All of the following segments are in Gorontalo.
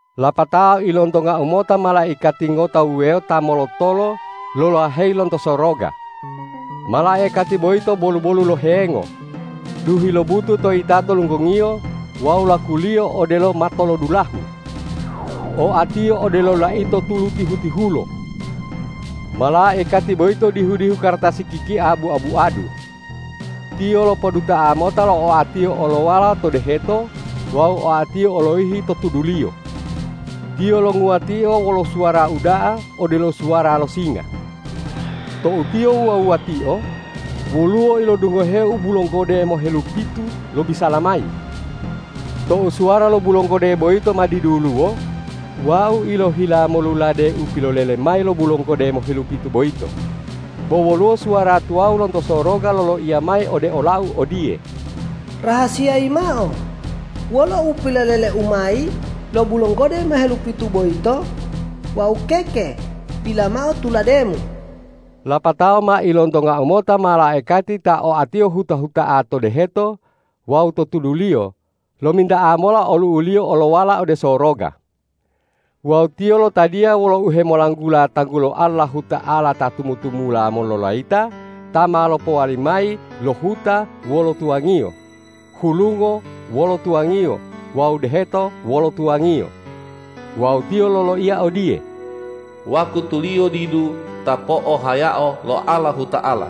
Lapatao ilontongau mota malaikati ngota wuwewo ta molotolo lolaheyi lonto soroga. Malaikati boyito bolu-bolu lo hengo, duhi lobutu to yitato lunggongiyo wawu lakuliyo odelo matolodulahu. Oatiyo odelo laito tulu tihu-tihulo. Malaikati boyito dihu-dihu kartasi kikia bua-buadu. Tiyo lopoduta'a mota lo oatiyo olowala to deheto wawu oatiyo oloyihi to tuduliyo. Tiyo longuwatio wolo suwara uda'a odelo suwara lo singa. Tou tiyo wuwa-wuwatio, woluwo ilodungoheu bulonggode mohelupitu lobisala mayi. Tou suwara lo bulonggode boyito ma diduluwo, wau ilohila molulade u pilolele mayi lo bulonggode mohelupitu boyito; bo woluwo suwara tuwawu lonto soroga loloiya mayi ode olau odiye,”Rahasiyayi mao wolo u pilolele mayi lo bulonggode mohelupitu boyito wawu keke dila mao tulademu!” Lapatao ma ilontongau mota malaikati ta oatiyo huta-huta'a to deheto wawu to tuduliyo lominta'a mola olu'uliyo olowala ode soroga. Wawu tiyo lotadiya wolo uhemolanggula tanggulo Allahuta'ala ta tumu-tumula mololayita ta ma lopowali mayi lo huta wolo tuwangiyo, hulungo wolo tuwangiyo wawu deheto wolo tuwangiyo. Wawu tiyo loloiya odiye,”Wakutuliyo didu ta po'ohayao lo Allahuta'ala!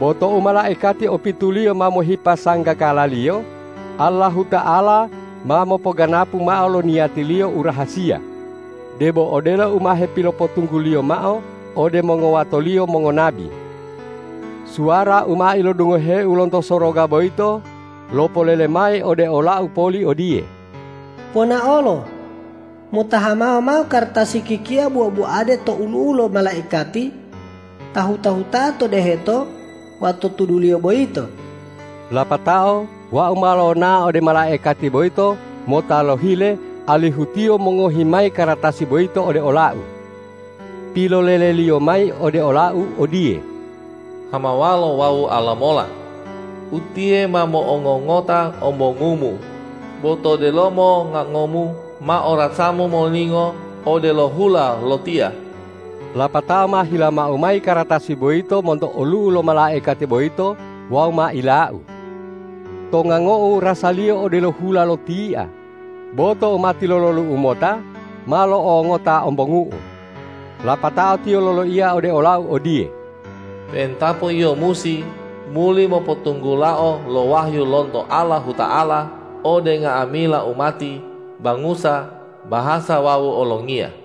Bo tou malaikati opituliyo ma mohipa sanggakalaliyo, Allahuta'ala ma mopoganapu mao lo niyati-Liyo u rahasiya, debo odelo u ma hepilopotunggu-Liyo mao ode mongowato-Liyo mongonabi.” Suwara u ma ilodungoheu lonto soroga boyito lopolele mayi ode olau poli odiye,”Ponaolo! Mota hamawa mao kartasi kikia bua-buade to olu'u lo malaikati ta huta-huta'a to deheto wawu to tuduliyo boyito.” Lapatao wau ma lonao ode malaikati boyito mota lohile alihu tiyo mongohi mayi kartasi boyito ode olau. Piloleleliyo mayi ode olau odiye,”Hamawalo wawu alamola. Utiye ma mo'ongongota ombongumu, bo to delomo ngangomu ma orasamu molingo odelo hula lo tia.” Lapatao ma hilamau mayi kartasi boyito monto olu'u lo malaikati boyito wawu ma ilau. To ngangou rasaliyo odelo hula lo tia, bo tou ma tilololu'u mota, ma lo'ongongota ombongu'u. Lapatao tiyo loloiya ode olau odiye,”Pe'entapo yio musi muli mopotunggulao lo wahyu lonto Allahuta'ala ode nga'amila umati, bangusa, bahasa wawu olongiya.”